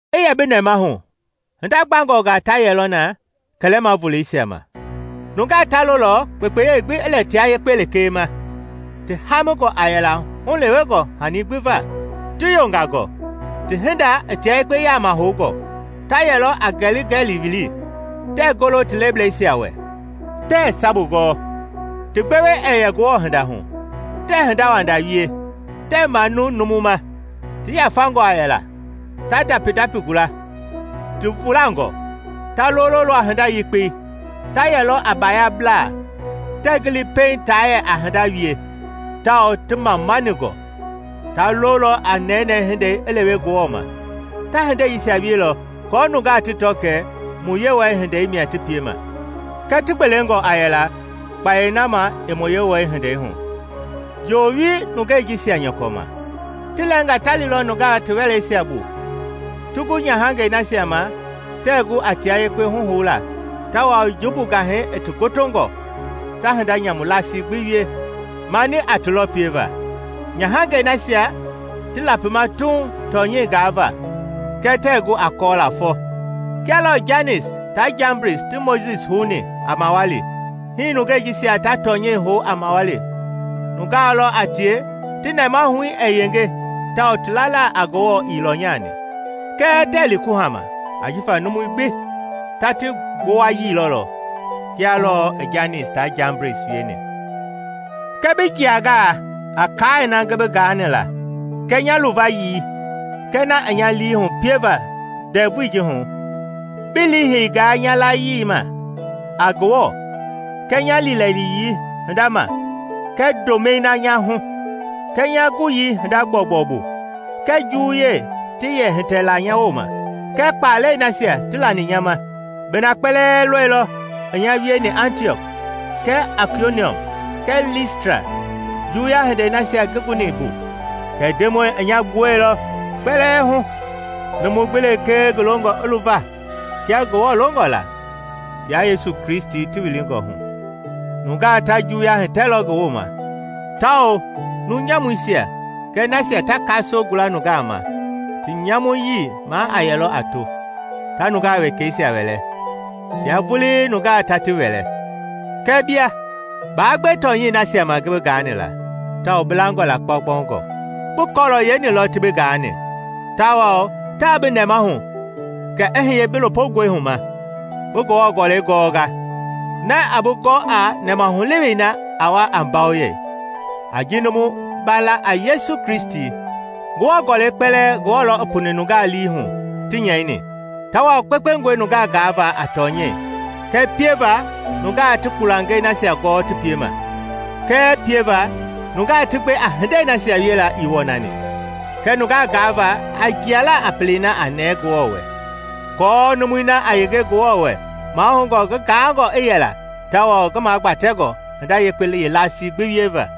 I yɛ bi nɛmahu, hinda gbangɔngaa ta yɛlɔ na kɛlɛma voleisia ma. Nunga ta lolɔ kpekpeyei gbi i lɛ tia yekpe lekee ma, ti haamingɔ a yɛla hulewengɔ hanii gbi va, ti yongangɔ, ti hinda i tia yekpe yaama houngɔ; ta yɛlɔ a ngɛli-ngɛlii wili, tɛɛ golo ti leblɛisia wɛ, tɛɛ sabu gɔɔ, ti gbewe ɛɛ yɛ Ngewɔ hinda hu; tɛɛ hindawanda wie, tɛɛ manu numu ma, ti yafangɔ a yɛla, ta ndapi-ndapi gula, ti vulangɔ; ta lololɔ a hinda yekpei; ta yɛlɔ a baayablaa, tɛɛ gili pɛiŋ taa yɛ a hinda wie, tawao ti mamaningɔ; ta lolɔ a nɛnɛɛ hindei i lewe Ngewɔ ma; ta hindeisia wielɔ aako nungaa ti tɔ kɛ mu Yewɔ-hindei mia ti piema, kɛɛ ti gbelengɔ a yɛla kpayei na ma i mu Yewɔ-hindei hu. Joowi nungei jisia nyɔkɔ ma. Ti lɛɛnga ta lilɔ nungaa ti wɛleisia bu, ti gu nyahangɛi nasia ma tɛɛ gu a tia yekpe huhoula tawao jumbu gahɛi i ti gotongɔ ta hinda nyamu laasi gbi wie mani a ti lɔ pieva; nyahangɛi nasia ti lapima tuuŋ tɔnyɛi gaava kɛɛ tɛɛ gu a kɔɔla fɔ. Kia lɔɔ Janis taa Jambris ti Mojisi houni a mawali, hii nungei jisia ta tɔnyɛi hou a mawali nungaa lɔ a tie ti nɛmahui ɛɛ yenge tawao ti lala a Ngewɔ ii lɔnyani. Kɛɛ tɛɛ li kuhama ajifa numui gbi ta ti gbowayii lɔlɔ, kia lɔɔ i Janis taa Jambris wieni. Kɛɛ bi jianga a kaai na ngi bi gaani la kɛɛ nya luvayii kɛɛ na i nya lii hu pieva ndɛvui ji hu; bi liiheinga nya layii ma a Ngewɔ, kɛɛ nya liilɛliyii hinda ma kɛɛ ndomɛi na nya hu, kɛɛ nya guyii hinda gbɔugbɔu bu, kɛɛ juwuyei ti yɛ hitɛ la nya wooma, kɛɛ kpalɛi nasia ti lani nya ma. Bi na kpɛlɛɛ lɔilɔ i nya wieni Antiɔk, kɛɛ Aikoniɔm, kɛɛ Listra, juwuya hindei nasia ngi guni mbu; kɛɛ Ndemɔi i nya gbuɛilɔ kpɛlɛɛ hu. Numu gbi lekee ngi longɔ i luva kia Ngewɔ longɔ la, tia Yesu Kristi ti wilingɔ hu, nungaa ta juwuya hitɛlɔ ngi wooma; tawao numu nyamuisia kɛɛ nasia ta kasoo gula nungaa ma, ti nyamuyii maa a yɛlɔ a to, ta nungaa wekɛisia wɛlɛ, tia vulii nungaa ta ti wɛlɛ. Kɛɛ bia, baa gbe tɔnyɛi nasia ma ngi bi gaani la tawao bi langɔ la kpaukpaungɔ. Bi kɔɔlɔ yeeni lɔ ti bi gaani, tawao taa bi nɛmahu kɛ i hiye bi lopongɔi hu ma, bi Ngewɔ Gɔlɛi gɔnga, na a bi gɔ a nɛmahulewei na a wa a mbawoyei, a ji numu ba la a Yesu Kristi. Ngewɔ Gɔlɛi kpɛlɛɛ Ngewɔ lɔ i puni nungaa lii hu ti nyɛini tawao kpekpengɔe nungaa gaava a tɔnyɛi, kɛɛ pieva nungaa ti kpulangei nasia gɔɔ ti piema, kɛɛ pieva nungaa ti gbe a hindei nasia wiela ii wɔnani, kɛɛ nungaa gaava a jiala a pelei na a nɛɛ Ngewɔ wɛ, aako numui na a yenge Ngewɔ wɛ mahoungɔ ngi gaangɔ i yɛla tawao ngi magbatɛngɔ hinda yekpe yeelasii gbi wieva.